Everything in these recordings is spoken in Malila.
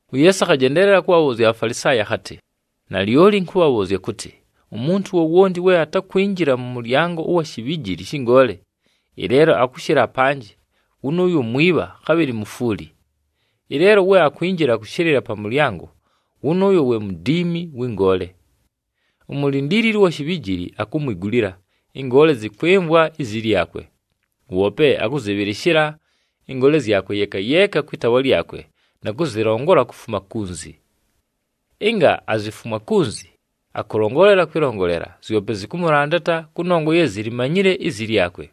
UYeesu akhajendeelela kʉbhabhʉʉzya aBhafalisaayi akhatɨ, “Nalyoli ɨnkʉbhabhʉʉzya kʉtɨ, umuntu wowonti we atakwinjila mʉ mʉlyango ʉwa shibhijili shɨ ngoole, ɨleelo akʉshɨla apanjɨ, wʉnʉʉyo mwibha, khabhɨlɨ mufwuli. Ɨleelo we akwinjila kʉshɨlɨla pa mʉlyango, wʉnʉʉyo we mudiimi wɨ ngoole. Umulindiilili ʉwa shibhijili akumwigulila, ɨngoole zɨkwɨmvwa izi lyakwe. Woope akʉzɨbhɨlɨshɨla ɨngoole zyakwe yeeka yeeka kwɨ taawa lyakwe na kʉzɨlongola kufuma kunzi. Ɨnga azifumwa kunzi, akʉlongolela kwɨlongolela, zyope zɨkʉmʉlandata kʉnongwa ye zilimanyile izi lyakwe.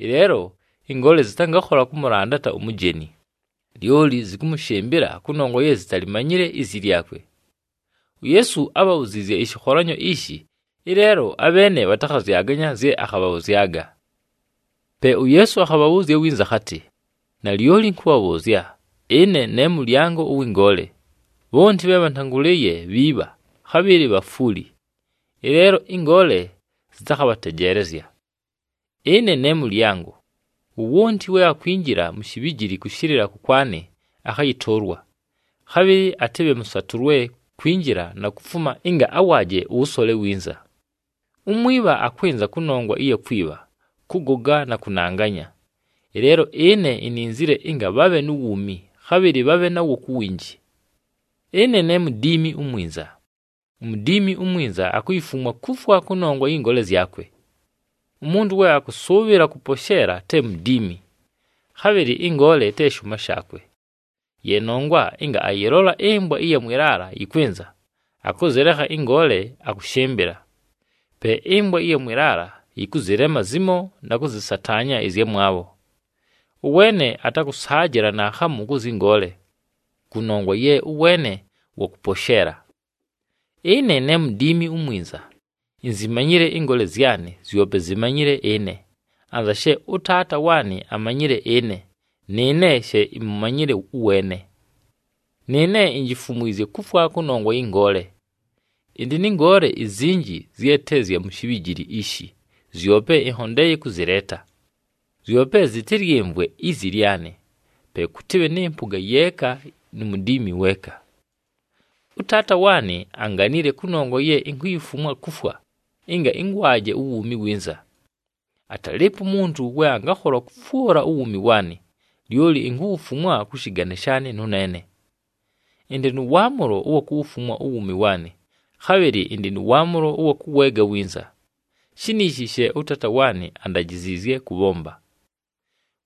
Ɨleelo ɨngoole zɨtangakhola kʉmʉlandata umujeni, lyoli zɨkʉmʉshɨmbɨla kʉnongwa ye zitalimanyile izi lyakwe.” UYeesu ábhabhuziizye ɨshɨkholanyo ishi, ɨleelo abheene bhatakhazyaganya zye akhabhabhʉzyaga. Pe uYeesu akhabhabhʉʉzya winza akhatɨ, “Nalyoli ɨnkʉbhabhʉʉzya, ɨne ne mʉlyango ʉwɨ ngoole. Bhonti bhe bhantangʉlɨɨye bhiibha, khabhɨlɨ bhafwuli, ɨleelo ɨngoole zɨtakhabhatejeelezya. Ɨne ne mʉlyango. Wowonti we akwinjila mu shibhijili kʉshɨlɨla kʉkwanɨ, akhayɨtʉʉlwa, khabhɨlɨ atɨbhe mʉsatʉlwe kwinjila na kufuma ɨnga awaaje ʉwʉsole winza. Umwibha akwɨnza kʉnongwa ɨya kwibha, kʉgoga na kʉnanganya. Ɨleelo ɨne ininzile ɨnga bhabhe nu wuumi, khabhɨlɨ bhabhe nawo ku winji. “Ɨne ne mudiimi umwinza. Umudiimi umwinza akuyifumwa kufwa kʉnongwa yɨ ngoole zyakwe. Umuntu we akʉsʉʉbhɨla kʉposheela te mudiimi, khabhɨlɨ ɨngoole te shʉʉma shaakwe. Ye nongwa ɨnga ayɨlola ɨmbwa ɨya mwɨ laala yɨkwɨnza, akʉzɨlekha ɨngoole akʉshɨmbɨla. Pe ɨmbwa ɨya mwɨ laala yɨkʉzɨlema zimo na kʉzɨsataanya ɨzyamwabho. Ʉweene atakʉsaajɨla naakhamu kʉ zyɨ ngoole, kʉnongwa ye ʉweene wa kʉposheela. Ɨne ne mudiimi umwinza. Inzimanyile ɨngoole zyanɨ, zyope zimanyile ɨne, anza she ʉTaata waanɨ amanyile ɨne, nɨɨne she imumanyile ʉweene. Nɨɨne injifumwizye kufwa kʉnongwa yɨ ngoole. Ɨndɨ nɨ ngoole izinji zye te zya mu shibhijili ishi, zyope ɨnhondeeye kʉzɨleeta. Zyope zɨtɨlyɨmvwe izi lyanɨ. Pe kʉtɨbhe nɨ mpʉga yeeka nu mudiimi weeka. “ɄTaata waanɨ anganile kʉnongwa ye inkuyifumwa kufwa, ɨnga ɨngwaje uwuumi winza. Atalɨɨpo umuntu we angakhola kʉfwʉla uwuumi waanɨ, lyoli inkuwufumwa kʉ shɨgane shaanɨ nʉneene. Ɨndɨ nʉ waamʉlo ʉwa kuwufumwa uwuumi waanɨ, khabhɨlɨ ɨndɨ nʉ waamʉlo ʉwa kʉweega winza. Shiniishi she ʉTaata waanɨ andajiziizye kʉbhomba.”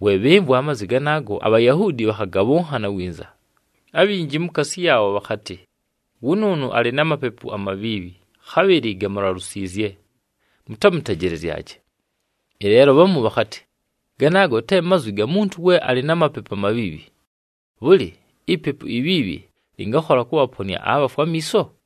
We bhɨmvwa amazwi ganaago, aBhayahuudi bhakhagabhʉnhana winza. Abhinji mukaasi yaabho bhakhatɨ, “Wʉnʉʉnʉ alɨ na mapepu amabhiibhi, khabhɨlɨ gamulalusiizye, mutamutejelezyaje.” Ɨleelo bhamu bhakhatɨ, “Ganaago te mazwi ga muntu we alɨ na mapepu amabhiibhi. Bhʉlɨ! Ipepu ibhiibhi lɨngakhola kʉbhaponɨa abhafwe amiiso?”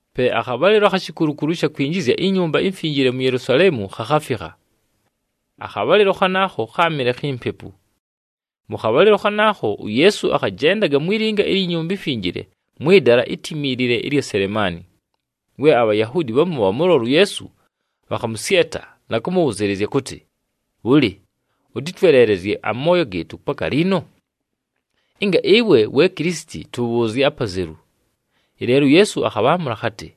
Pe akhabhalɨlo akhi shikulukulu ɨsha kwinjizya iNyumba iMfinjile mu Yelusaleemu khakhafikha. Akhabhalɨlo khanaakho kháamɨle khi mpepu. Mʉ khabhalɨlo khanaakho, uYeesu akhajendaga mwi linga ilyi Nyumba iMfinjile mwɨ dala itimiilile ɨlya Selemaani. We aBhayahuudi bhamu bhamʉlola uYeesu, bhakhamʉsyeta na kʉmʉbhʉzɨɨlɨzya kʉtɨ, “Bhʉlɨ, ʉtɨtweleelezye amooyo gɨɨtʉ paka liino? Ɨnga ɨwe we Kilisiti, tʉbhʉʉzye apazelu.” Ɨleelo uYeesu akhabhaamʉla akhatɨ,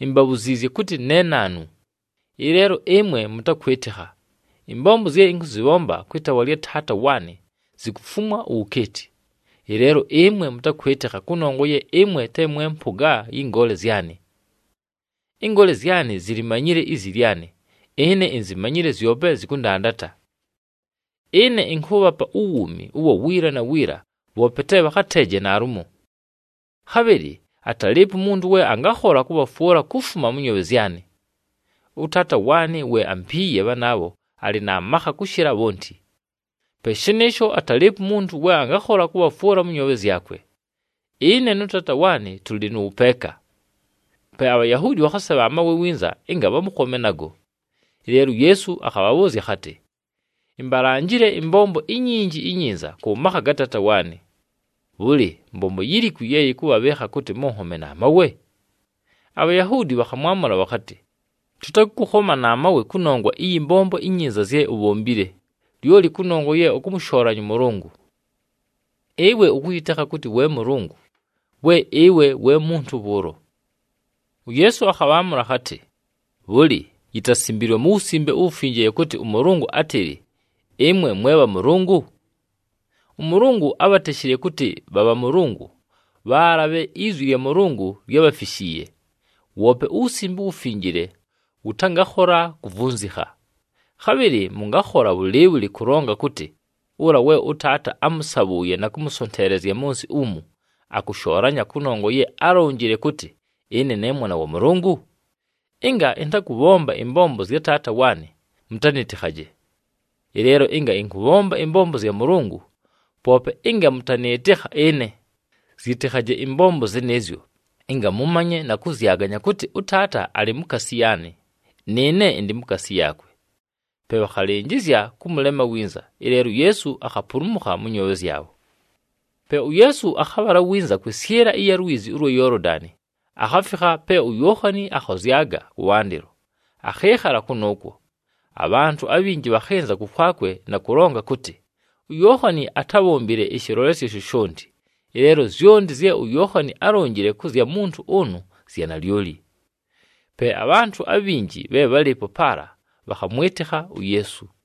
“Imbabhuziizye kʉtɨ ne naanu, ɨleelo ɨmwe mʉtakwɨtɨkha. Ɨmbombo zye ɨnkʉzɨbhomba kwɨ taawa lya Taata waanɨ zikufumwa uwukeeti. Ɨleelo ɨmwe mʉtakwɨtɨkha kʉnongwa ye ɨmwe te mwe mpʉga yɨ ngoole zyanɨ. Ɨngoole zyanɨ zilimanyile izi lyanɨ. Ɨne inzimanyile, zyope zɨkʉndandata. Ɨne ɨnkʉʉbhapa uwuumi ʉwa wiila na wiila, bhoope te bhakhateeje naalumo. Khabhɨlɨ atalɨɨpo umuntu we angakhola kʉbhafwʉla kufuma mʉ nyoobhe zyanɨ. ɄTaata waanɨ we ampiiye bhanaabho alɨ na makha kʉshɨla bhonti. Pe shɨnɨɨsho atalɨɨpo umuntu we angakhola kʉbhafwʉla mʉ nyoobhe zyakwe. Ɨne nʉ Taata waanɨ tʉlɨ nʉ wʉpeeka.” Pe aBhayahuudi bhakhasebha amawe winza ɨnga bhamʉkhome nago. Ɨleelo uYeesu akhabhabhʉʉzya akhatɨ, “Imbalanjile ɨmbombo inyinji inyinza kʉ makha ga Taata waanɨ. Bhʉlɨ, mbombo yilikwi ye yɨkʉbhabhɨɨkha kʉtɨ mʉnhome na mawe?” ABhayahuudi bhakhamwamʉla bhakhatɨ, “Tʉtakʉkʉkhoma na mawe kʉnongwa ɨyɨ mbombo inyinza zye ubhombile, lyoli kʉnongwa ye ʉkʉmʉshoolanya ʉMʉlʉngʉ. Ɨwe ʉkʉyɨtekha kʉtɨ we Mʉlʉngʉ we ɨwe we muntu bhʉʉlo!” UYeesu akhabhaamʉla akhatɨ, “Bhʉlɨ, yitasimbiilwe mu Wusimbe uWufinjile kʉtɨ ʉMʉlʉngʉ átɨlɨ, ‘Ɨmwe mwe bhamʉlʉngʉ’? ɄMʉlʉngʉ ábhateshile kʉtɨ bha bhamʉlʉngʉ, bhaala bhe izwi lya Mʉlʉngʉ lyábhafishiiye, woope uWusimbe uWufinjile wʉtangakhola kuvunzikha. Khabhɨlɨ mʉngakhola bhʉlɨɨbhʉlɨ kʉlonga kʉtɨ ʉla we ʉTaata ámʉsabhʉʉye na kʉmʉsonteelezya mʉ nsɨ umu, akʉshoolanya kʉnongwa ye álonjile kʉtɨ, ‘Ɨne ne Mwana wa Mʉlʉngʉ’? Ɨnga ɨntakʉbhomba ɨmbombo zya Taata waanɨ, mʉtanɨtɨkhaje. Ɨleelo ɨnga ɨnkʉbhomba ɨmbombo zya Mʉlʉngʉ, poope ɨnga mʉtanɨɨtɨkha ɨne, zyitikhaji ɨmbombo zɨnɨɨzyo, ɨnga mʉmanye na kʉzyaganya kʉtɨ ʉTaata alɨ mukaasi yaanɨ, nɨɨne ɨndɨ mukaasi yaakwe.” Pe bhakhalɨnjɨzya kʉmʉlema winza, ɨleelo uYeesu akhapulumukha mʉ nyoobhe zyabho. Pe uYeesu akhabhala winza kwɨsyɨla ɨya lwizi ʉlwa Yoolodani, akhafikha pe uYookhani akhozyaga kʉwandɨlo, akhɨɨkhala kʉnʉʉkwo. Abhantʉ abhinji bhakhɨnza kʉkwakwe na kʉlonga kʉtɨ, “UYookhani atábhombile ɨshɨlolesyo shoshonti, ɨleelo zyonti zye uYookhani álonjile kʉ zya muntu ʉnʉ zya nalyoli.” Pe abhantʉ abhinji bhe bhálɨɨpo paala bhakhamwɨtɨkha uYeesu.